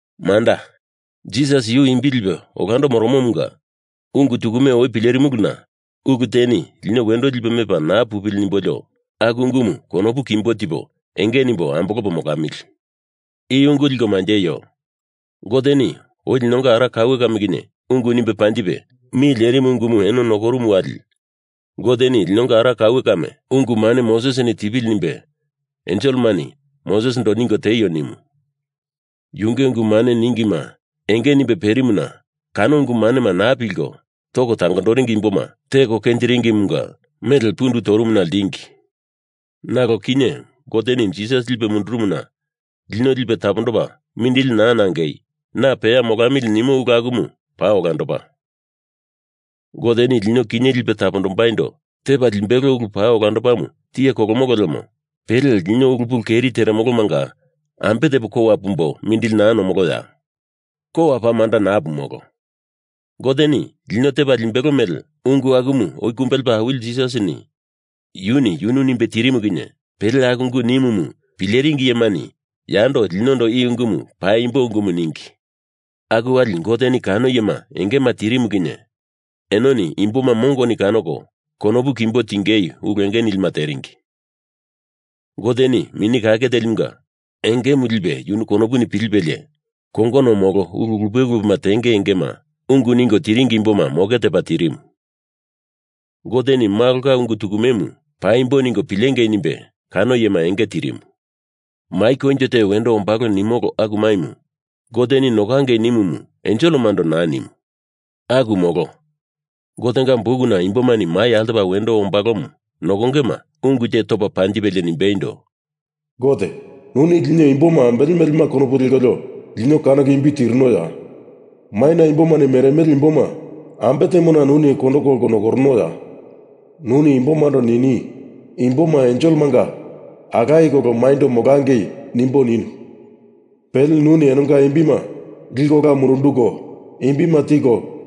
Manda, Jisas yu imbi lipe olando moromomunga ungu tukume oi pilerimuluna ulu teni lino wendo lipe mepa naa pupili nimbolio aku ungumu konopu kimbo tipo enge nimbo ambolopo molamili. I ungu liko manjeio. Goteni oi linonga ara kaue kame kinye ungu nimbe panjipe mi lerimu ungumu eno nokorumu wali Goteni linonga ara kaue kame ungu mane Mosesini tipili nimbe enselemani Moses ningo tieio nimu. Yunge ungu mane ningima enge nimbe perimuna kano ungu manema naa pilko toko tangondoringi imboma teko kenjiringimunga mele pundu torumuna ltingi. Nalo kinye Goteni Jisas lipe mundurumuna lino lipe tapondopa mindili naa nangei, na peya molamili nimo ulu akumu paa olandopa. Goteni lino kinye lipe tapondombaindo tepa limbelo ulu paa olandomu tiye kolomolo lemo pele lino ulu pulu keri teremolomanga ambe tepo kowa pumbo mindili naa nomoloya? Kowa paa manda naa pumolo. Goteni lino tepa limbelo mele ungu akumu oi kumbe lepa Awili Jisas yuni yunu nimbe tirimu kinye pele aku ungu nimumu pileringi iyemani yando linondo i ungumu paimbo ungumu ningi. Aku wali Goteni kano iyema engema tirimu kinye enoni imboma mongoni kanoko konopu kimbo tingei ulu enge nilima teringi. Goteni Mini Kake Telimunga engemu lipe yunu konopuni pilipelie kongono molo ulu lupe lupema tenge engema ungu ningo tiringi imboma moke tepa tirimu. Goteni Malonga ungu tukumemu paimbo ningo pilengei nimbe kano iyema enge tirimu. Mai koinjo te wendo ombalo nimolo aku maimu Goteni nokangei nimumu enselemando naa nimu. Aku molo. Gotenga bukuna imbomani mai altopa wendo ombalomu nokongema ungu te topa panjipelie nimbeindo, Gote, nuni lino imboma ambele melema konopu lekolio lino kanoko imbi tirinoya? Maina imbomani meremele imboma ambe temona nuni kondo kolko nokoronoya? Nuni imbomando nini, imboma enselemanga alaye kolo mainyendo molangei nimbo ninu. Pele nuni enonga imbima liko ola mundunduko, imbima tiko,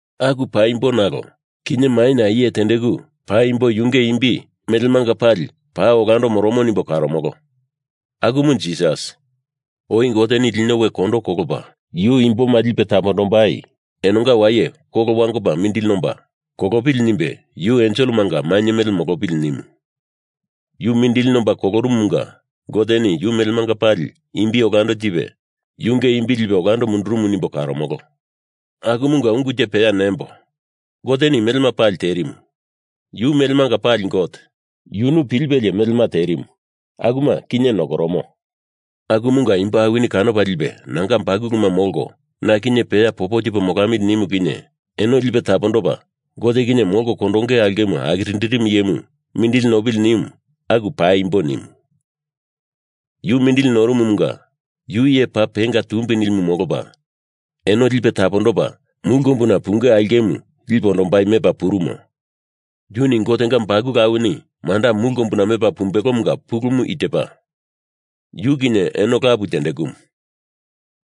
Aku paimbo nalo kinye maina iye tendeku paimbo yunge imbi melemanga pali paa olando moromo nimbo karomolo. Akumu Jisas. Oi Goteni lino we kondo kolopa yu imboma lipe tapondombai enonga waye kolo wangopa mindili nomba kolopili nimbe yu enselemanga mainye mele molopili nimu. Yu mindili nomba kolorumumunga Goteni yu melemanga pali imbi olando tipe yunge imbi lipe ola mundurumu nimbo karomolo. Akumunga ungu te peya nembo. Goteni melema pali terimu. Yu melemanga pali Gote. Yunu pilipelie melema terimu, akuma kinye nokoromo. Akumunga imbo awini kanopa lipe nanga bakuluma molko, na kinye peya popo tipo molamili nimu kinye eno lipe tapondopa Gote kinye molko kondonge aulkemu akirindirimu iyemu mindili nopili nimu aku paimbo nimu. Yu mindili norumumunga yu iye paa penga tumbi nilimu molopa eno lipe tapondopa mulu kombuna punge aulkemu lipe ondombai mepa purumo. Yuni Gotenga bakulu awini manda mulu kombuna mepa pumbelomunga pulumu i tepa: Yu kinye eno lapu tendekumu.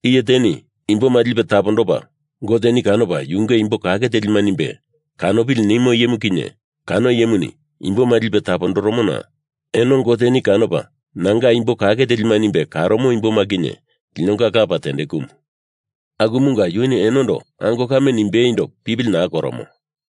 Iye teni imboma lipe tapondopa Goteni kanopa yunge imbo kake telima nimbe kanopili nimo iyemu kinye kano iyemuni imboma lipe tapondoromona eno Goteni kanopa nanga imbo kake telima nimbe karomo imboma kinye linonga Lapa tendekumu. Akumunga yuni enondo ango kame nimbeindo pipili naa koromo.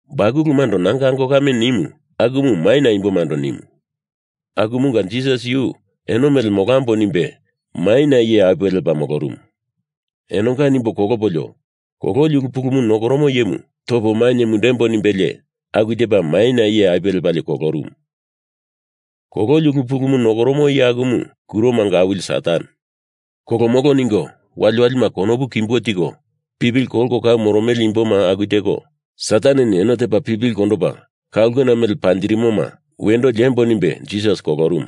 Bakulumando nanga ango kame nimu akumu maina imbomando nimu, akumunga Jisas yu eno mele molambo nimbe maina iye apuwe lepa molorumu. Enonga nimbo kolopolio kololi ulu pulumu nokoromo iyemu topo mainye mundembo nimbelie aku tepa maina iye apuwe lepalie kolorumu. Kololi ulu pulumu nokoromo iye akumu kuromanga awili Satan. Kolomolo ningo waliwalima konopu kimbo tiko pipili kolko kau moromele imboma aku teko Sataneni eno tepa pipili kondopa ka ulkena mele panjirimoma wendo liembo nimbe Jisas kolorumu.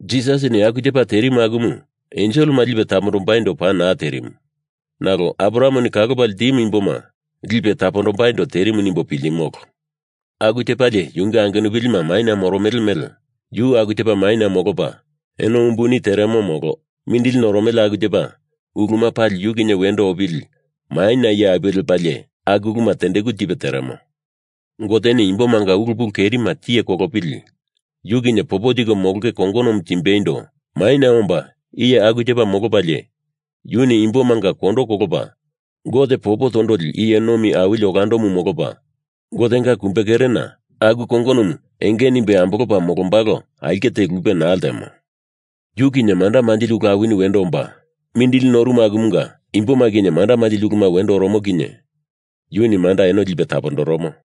Jisasini aku tepa terimu akumu enselema lipe tapondombaindo paa naa terimu nalo Abrahameni kalopa ltimu imboma lipe tapondombaindo terimu nimbo piltimolo. Aku tepalie yunge angenupilima maina moromele mele yu aku tepa maina molopa eno umbuni teremo molo mindili noromele aku tepa uluma pali yu kinye wendo opili maina iye apuwe lepalie aku uluma tendeku tipe teremo. Goteni imbomanga ulu pulu kerima tiye kolopili yu kinye popo tiko molonge kongonomu tembaindo maina omba iye aku tepa molopalie yuni imbomanga kondo kolopa Gote popo tondoli iye nomi awili olandomu molopa Gotenga kumbe kerena aku kongonomu enge nimbe ambolopa molombalo aulke te lupe naa ltemo. Yu kinye manda manjili ulu awini wendo omba, mindili norumu akumunga imboma kinye manda manjili uluma wendo oromo kinye yuni manda eno lipe tapondoromo.